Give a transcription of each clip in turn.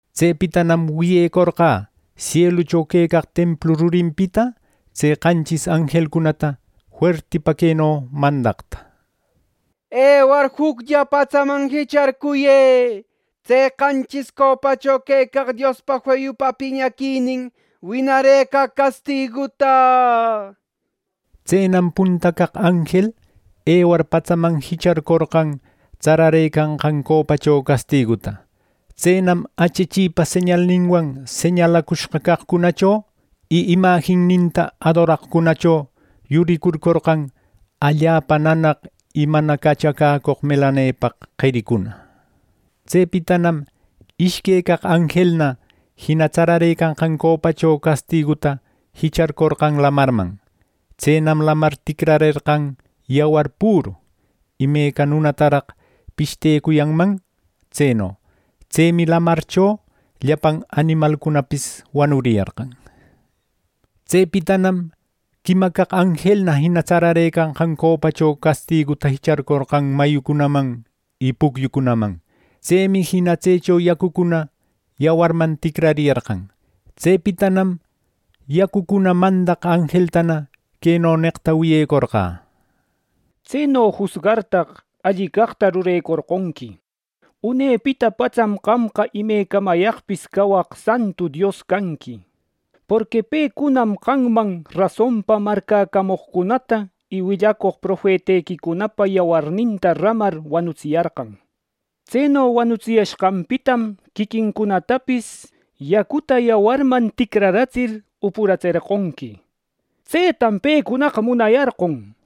Tsepitanam wiyecorqä sielucho quecaq templu rurinpita tse qanchis anjelcunata fuertipa queno mandaqta: “Ewar juclla patsaman jicharcuyë tse qanchis copacho quecaq Diospa feyupa piñaquinin winarëcaq castiguta” neqta. Tsenam punta caq anjel ewar patsaman jicharcorqan tsararëcanqan copacho castiguta. Tsenam achachipa señalninwan señalacushqa caqcunacho y imajinninta adoraqcunacho yuricurcorqan allapa nanaq y mana cachacäcoq melanepaq qericuna. Tsepitanam ishque caq anjelna jina tsararëcanqan copacho castiguta jicharcorqan lamarman. Tsenam lamar ticrarerqan yawar püru, imeca nunataraq pishtecuyanman tseno. Tsemi lamarcho llapan animalcunapis wanuriyarqan. Tsepitanam quima caq anjelna jina tsarecanqan copacho castiguta jicharcorqan mayucunaman y pucyucunaman. Tsemi jina tsecho yacucuna yawarman ticrariyarqan. Tsepitanam yacucuna mandaq anjeltana queno neqta wiyecorqä: “¡Tseno jusgartaq, alli caqta rurecorqonqui! Unepita patsam qamqa imecamayaqpis cawaq santu Dios canqui. Porqui pecunam qamman rasonpa marcäcamoqcunata y willacoq profetequicunapa yawarninta ramar wanutsiyarqan. Tseno wanutsiyashqanpitam quiquincunatapis yacuta yawarman ticraratsir, upuratserqonqui. ¡Tsetam pecunaqa munayarqon!” neqta.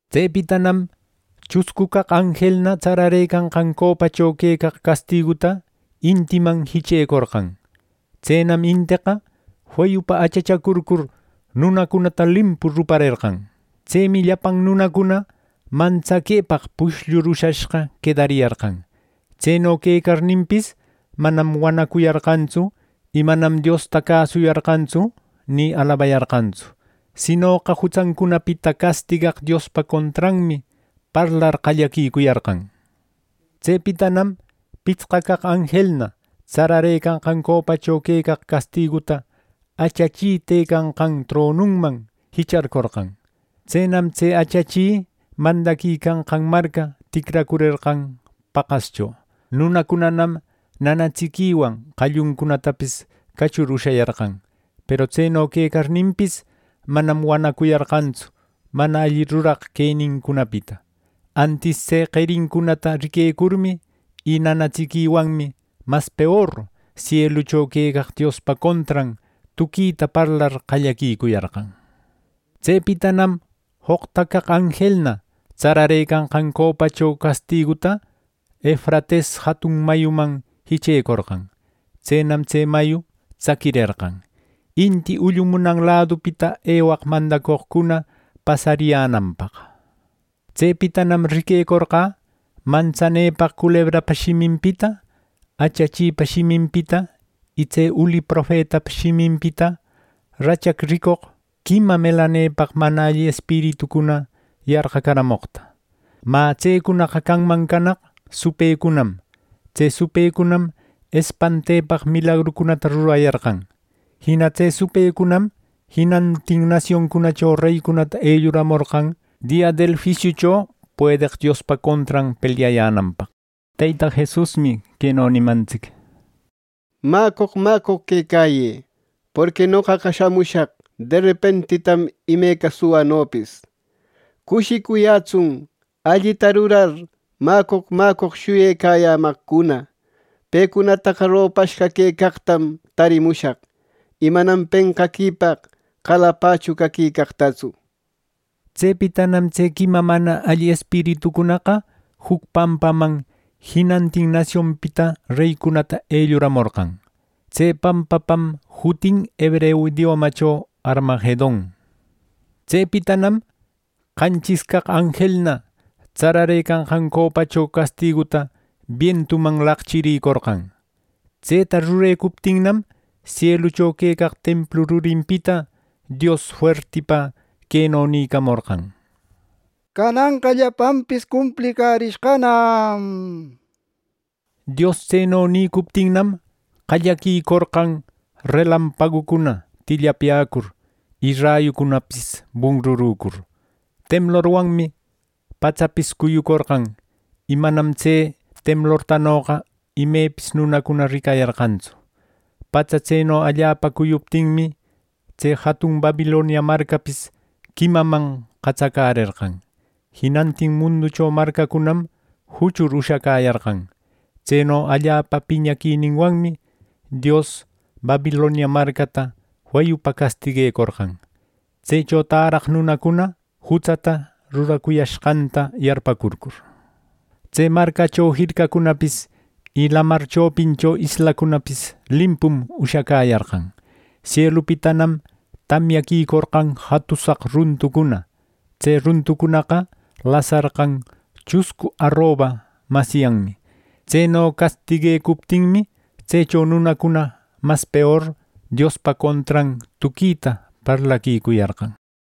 Tsepitanam chuscu caq anjelna tsararëcanqan copacho quecaq castiguta intiman jichecorqan. Tsenam inteqa feyupa achachacurcur, nunacunata limpu ruparerqan. Tsemi llapan nunacuna mantsaquepaq pushllur ushashqa quedariyarqan. Tseno quecarninpis, manam wanacuyarqantsu, y manam Diosta cäsuyarqantsu ni alabayarqantsu. Sinoqa jutsancunapita castigaq Diospa contranmi parlar qallaquicuyarqan. Tsepitanam pitsqa caq anjelna tsararëcanqan copacho quecaq castiguta achachi tëcanqan tronuman jicharcorqan. Tsenam tse achachi mandaquicanqan marca ticracurerqan paqascho. Nunacunanam nanatsiquiwan qalluncunatapis cachur ushayarqan. Peru tseno quecarninpis, manam wanacuyarqantsu mana alli ruraq quenincunapita. Antis tse qerincunata riquecurmi, y nanatsiquiwanmi mas peor sielucho quecaq Diospa contran tuquita parlar qallaquicuyarqan. Tsepitanam joqta caq anjelna tsararëcanqan copacho castiguta Efrates jatun mayuman jichecorqan. Tsenam tse mayu tsaquirerqan, inti ullumunan ladupita ewaq mandacoqcuna pasariyänanpaq. Tsepitanam riquecorqä mantsanepaq culebrapa shiminpita, achachipa shiminpita y tse uli profetapa shiminpita rachac ricoq quima melanepaq mana alli espiritucuna yarqacaramoqta. Mä tsecunaqa canman canaq supëcunam. Tse supëcunam espantepaq milagrucunata rurayarqan. Jina tse supëcunam jinantin nasioncunacho reycunata elluramorqan dia del juisiucho puedeq Diospa contran pelyayänanpaq. Teyta Jesusmi queno nimantsic: “Mäcoq mäcoq quecayë, porqui noqaqa shamushaq derepentitam imeca suwanopis. ¡Cushicuyätsun allita rurar mäcoq mäcoq shuyecayamaqcuna! Pecunataqa ropashqa quecaqtam tarimushaq, y manam penqaquipaq qalapachu caquicaqtatsu.” Tsepitanam tse quima mana alli espiritucunaqa juc pampaman jinantin nasionpita reycunata elluramorqan. Tse pampapam jutin hebreu idiomacho “Harmagedon”. Tsepitanam qanchis caq anjelna tsararëcanqan copacho castiguta bientuman laqchiricorqan. Tseta rurecuptinnam, sielucho quecaq templu rurinpita Dios fuertipa queno nïcamorqan: “Cananqa llapanpis cumplicärishqanam” nir. Dios tseno nïcuptinnam, qallaquicorqan relampagucuna tillapyäcur y rayucunapis bunrurücur. Temlorwanmi patsapis cuyucorqan, y manam tse temlortanoqa imepis nunacuna ricayarqantsu. Patsa tseno allapa cuyuptinmi, tse jatun Babilonia marcapis quimaman qatsacärerqan. Jinantin munducho marcacunam juchur ushacäyarqan. Tseno allapa piñaquininwanmi Dios Babilonia marcata feyupa castiguecorqan, tsecho täraq nunacuna jutsata ruracuyashqanta yarparcurcur. Tse marcacho jircacunapis, y lamar chopincho islacunapis limpum ushacäyarqan Sielupitanam tamyaquicorqan jatusaq runtucuna. Tse runtucunaqa lasarqan chuscu aroba masyanmi. Tseno castiguecuptinmi, tsecho nunacuna mas peor Diospa contran tuquita parlaquicuyarqan.